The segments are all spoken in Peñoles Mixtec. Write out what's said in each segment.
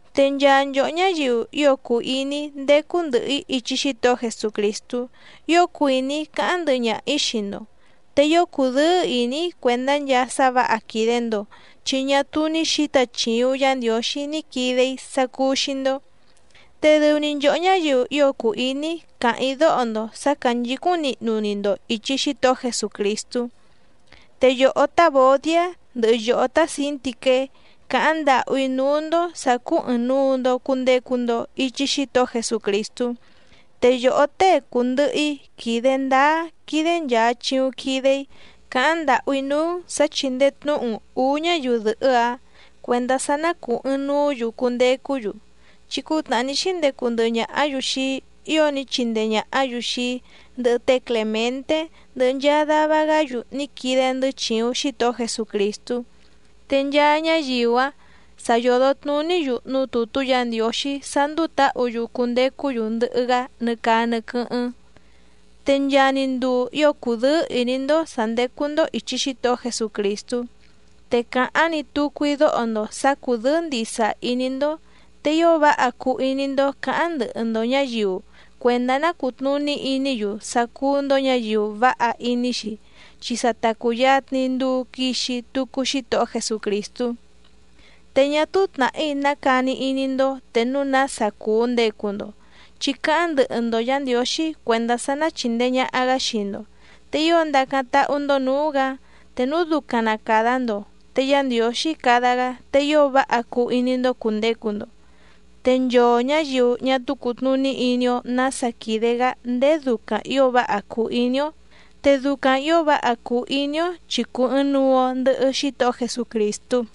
Te nchaa nchòhó ñáyiu ío cùu iní‑í ndécú ndɨ̀hɨ‑í ichi Xítohó Jesucrìstú ío cuìní‑í cáháⁿ ndɨhɨ ñaha‑ǐ xii‑ndo. Te ío cùdɨ́ɨ́ ìní‑í cuèndá nchaa sá vǎha quìde‑ndo chi ñá túú ní xǐta chìuⁿ Yá Ndiǒxí ní quide‑í sá cúú‑xí‑ndó, te dɨu‑ni nchòhó ñáyiu ío cùu iní‑í càháⁿ‑í dóho‑ndo sǎ cánchǐcúⁿ nihnu‑ni‑ndo ìchi Xítohó Jesucrìstú. Te yòhó tá Vòdiá ndɨhɨ yòhó tá Sǐntiqué càháⁿ ndàhú‑í núú‑ndó sǎ cúú ɨ̀ɨⁿnuu‑ndo cundecu‑ndo ichi Xítohó Jesucrìstú. Te yòhó tée cùndɨhɨ‑í quìde ndáá quídé nchàa chiuⁿ quide‑í, càháⁿ ndàhú‑í núú‑n sǎ chíndèe tnúhu‑n ǔú ñáyiu dɨ̀hɨ́‑áⁿ cuèndá sá ná cùu ɨɨⁿnuú‑yu cundecú‑yu, chi cútnàhá ní xíndecu ndɨhɨ ñàhá‑yu xii‑í ío ní chindee ñàhá‑yu xii‑í, ndɨhɨ té Clèmenté, ndɨhɨ nchaa dava‑gá‑yu ní quide‑ndɨ́ chìuⁿ Xítohó Jesucrìstú, te nchaa ñáyiu‑áⁿ sa yòdo tnuní‑yu núú tùtú Yǎ Ndiǒxí sá ndúú tǎhǔ‑yu cundecú‑yu ndɨhɨ‑gá nɨ caa nɨ quɨ́hɨ́ⁿ. Te nchaa‑ni nduu ío cudɨ́ɨ́ ìní‑ndó sǎ ndécú‑ndó ìchi Xítohó Jesucrìstú. ¡Te càháⁿ‑ni tucu‑í dóho‑ndo sǎ cúdɨ̌ɨ́ ndìsa iní‑ndó! Te ío váha cuu iní‑ndó cǎháⁿ ndɨhɨ‑ndo ñǎyiu cuèndá ná cùtnuní iní‑yu sá cúú‑ndó ñǎyiu váha iní‑xi, chi sa ta cùyatni nduu quixi tucu Xítohó Jesucrìstú. Te ñá túú tnàhí ná cani iní‑ndó te núu nása cùu ndecu‑ndo, chi cáháⁿ ndɨhɨ‑ndo Yǎ Ndiǒxí cuèndá sá ná chìndee ñaha‑gá xii‑ndo. Te ío ndacáⁿ táhú‑ndó nǔú‑gǎ. Te núu ducaⁿ na càda‑ndo te Yá Ndiǒxí cada‑gá te ío váha cuu iní‑ndó cùndecu‑ndo. Te nchoo ñǎyiu ñá túú cùtnuní iní‑ó nǎsa quìde‑gá ndéé ducaⁿ ǐo váha cùu iní‑ó, te ducaⁿ ǐo váha cùu iní‑ó chi cùu ɨɨⁿnuu‑o ndɨhɨ Xítohó Jesucrìstú.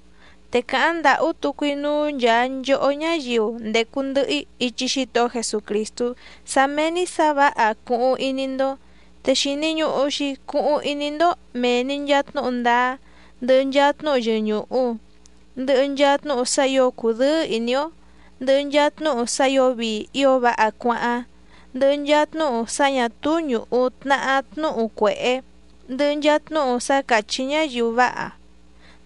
Te càháⁿ ndàhú tucu‑í núú nchàa nchohó ñáyiu ndècu ndɨhɨ‑í ichi Xítohó Jesucrìstú sá méé‑ní sǎ vǎha cuhuⁿ iní‑ndó. Te xìni ñuhu‑xi cuhuⁿ iní‑ndó mèe‑ni nchaa tnúhu ndáá, ndɨhɨ nchaa tnúhu yɨñùhu, ndɨhɨ nchaa tnúhu sá ǐo cudɨ́ɨ́ ìní‑ó, ndɨhɨ nchaa tnúhu sá ǐo vii ío váha cuáháⁿ, ndɨhɨ nchaa tnúhu sá ñà túú ñùhu tnahá tnúhu cuèhé, ndɨhɨ nchaa tnúhu sá càchí ñáyiu váha,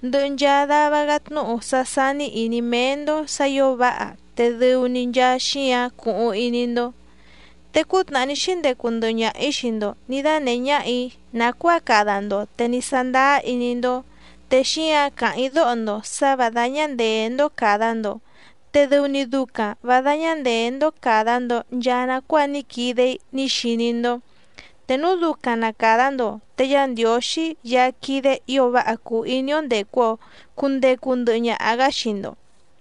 ndɨhɨ nchaa dava‑gá tnúhu sá sání ìní méé‑ndó sǎ ǐo váha te dɨu‑ni nchaa xíǎⁿ cuhuⁿ iní‑ndó. Te cútnàhá ní xíndecu ndɨhɨ ñaha‑ǐ xii‑ndo nǐ dánèhé ñáhà‑í nàcuáa cada‑ndo te ní sándáá iní‑ndó. Te xíǎⁿ càháⁿ‑í dóho‑ndo sǎ vǎ dáñá ndèé‑ndó càda‑ndo, te dɨu‑ni ducaⁿ vǎ dáñá ndèé‑ndó càda‑ndo nchaa nacuáa ní quide‑í ní xiní‑ndó. Te núu ducaⁿ na càda‑ndo te Yá Ndiǒxí Yaá quídé ǐo váha cùu iní‑ó ndècu‑o cundecu ndɨhɨ ñaha‑gá xii‑ndo.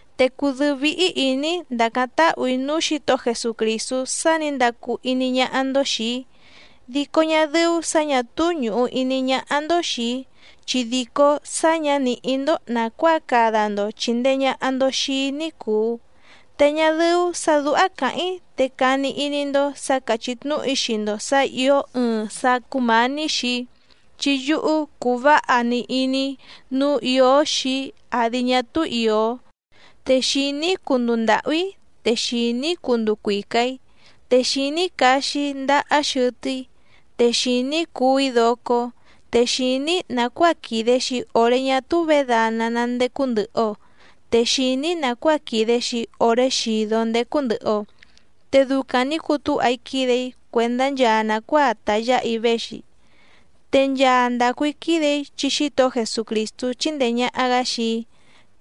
Te cùdɨ́ɨ́ víhí ìní‑í ndàcáⁿ táhù‑í núú Xǐtohó Jesucrìstú sá nǐ ndacu iní ñáhá‑ndó xìi‑í, dico ñá dɨ́ú sǎ ñà túú ñùhu iní ñáhá‑ndó xìi‑í chi dìcó sá ñǎ nìhí‑ndó nàcuáa cada‑ndo chìndee ñaha‑ndo xii‑í ní cùu. Te ñá dɨ́ú sǎ dúhá càháⁿ‑í te cani iní‑ndó sǎ càchí tnúhu‑í xii‑ndo sǎ ìó ɨɨⁿ sá cúmǎní xii‑í, chi yúhú cùu váha‑ni iní‑í nǔu ìó xii‑í àdi ñá túú ìó. Te xìní‑í cunduu ndàhú‑í, te xìní‑í cunduu cuica‑ǐ, te xìní‑í caxi‑í ndahá xɨtɨ́‑í, te xìní‑í cuú‑í docó, te xìní‑í nàcuáa quìde‑xi oré ñá túú vědana ná ndécú ndɨ̀hɨ‑o, te xìní‑í nàcuáa quìde‑xi oré xìdó ndécú ndɨ̀hɨ‑o. Te ducaⁿ nǐ cutúha‑í quídè‑í cuèndá nchaa nàcuáa ta yǎha‑í véxi. Te nchaa ndàcu‑í quídè‑í chi Xítohó Jesucrìstú chíndèe ñaha‑gá xii‑í.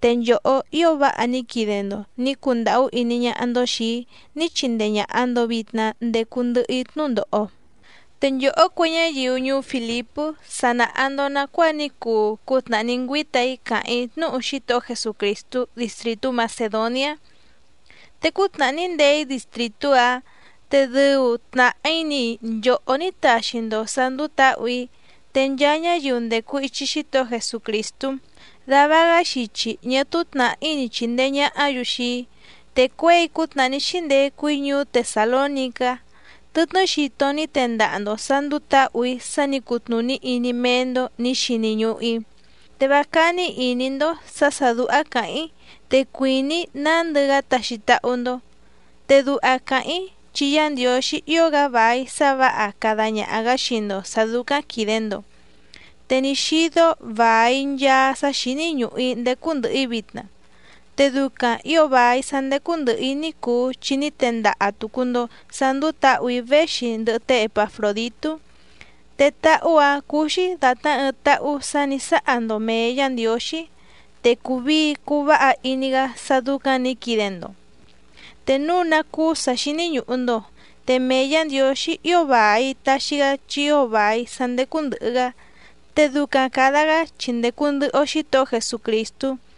Te nchòhó ío váha ní quide‑ndo nǐ cundàhú iní ñáhá‑ndó xìi‑í ní chindee ñàha‑ndo vitna ndecu ndɨhɨ‑í tnúndòho. Te nchòhó cue ñáyiu ñuú Fìlipú sa nàha‑ndo nacuáa ní cuu cútnàhá ní ngüíta‑í càháⁿ‑í tnúhu Xítohó Jesucrìstú distrìtú Macèdoniá, te cútnàhá ní ndee‑í distrìtú‑áⁿ te dɨu tnàhí‑ni nchòhó ní taxi‑ndo sǎ ndúú tǎhù‑í, te nchaa ñáyiu ndècu ichi Xítohó Jesucrìstú dava‑gá xichi ñá túú tnàhí ni chìndee ñahá‑yu xii‑í. Te cuěi cútnàhá ní xíndecu‑í ñuú Tesàlónicá tɨtnɨ́ xito ní tendaha‑ndo sǎ ndúú tǎhù‑í sá nǐ cutnùní iní méé‑ndó nǐ xini ñùhu‑í. Te vá cání ìní‑ndó sǎ sà dúhá càháⁿ‑í te cuìní‑í nándɨ‑gá taxi táhú‑ndó, te duha càháⁿ‑í chi Yá Ndiǒxí ío‑gá vài sá vǎha cada ñaha‑gǎ xii‑ndo sǎ dúcáⁿ quìde‑ndo. Te ní xídó vài nchaa sá xíní ñùhu‑í ndécú ndɨ̀hɨ‑í vitna, te ducaⁿ ǐo vài sá ndécú ndɨ̀hɨ‑í ní cuu chi ní tendaha tùcu‑ndo sá ndúú tǎhù‑í véxi ndɨhɨ té Epafròditú. Te táhú‑a cùu‑xi datná ɨɨⁿ táhú sǎ nǐ sáha‑ndo mèe Yá Ndiǒxí, te cùu vii cuu váha iní‑gá sá dúcáⁿ nǐ quide‑ndo. Te núu ná cúú sǎ xíní ñùhu‑ndo, te mee Yǎ Ndiǒxí ío vài taxi‑gá chi ío vài sá ndécú ndɨ̀hɨ‑gá, te ducaⁿ càda‑gá chi ndècu ndɨhɨ‑o Xítohó Jesucrìstú.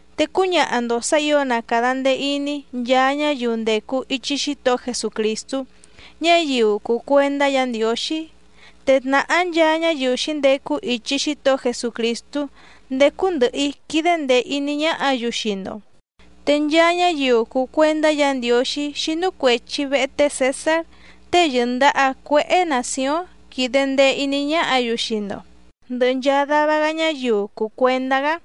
Te cúñaha‑ndo sǎ ǐo na càda ndee iní nchaa ñáyiu ndècu ichi Xítohó Jesucrìstú, ñáyiu cùu cuendá Yǎ Ndiǒxí. Te tnàhá nchaa ñáyiu xǐndecu ichi Xítohó Jesucrìstú ndécú ndɨ̀hɨ‑í quídé ndèe iní ñáhǎ‑yu xii‑ndo. Te nchaa ñáyiu cùu cuendá Yǎ Ndiǒxí xínú cuèchi vehe té Cèsár tée yɨ̀ndaha cuéhé nàcióⁿ quídé ndèe iní ñáhǎ‑yu xii‑ndo, ndɨhɨ nchaa dava‑gá ñáyiu cùu cuendá‑gá.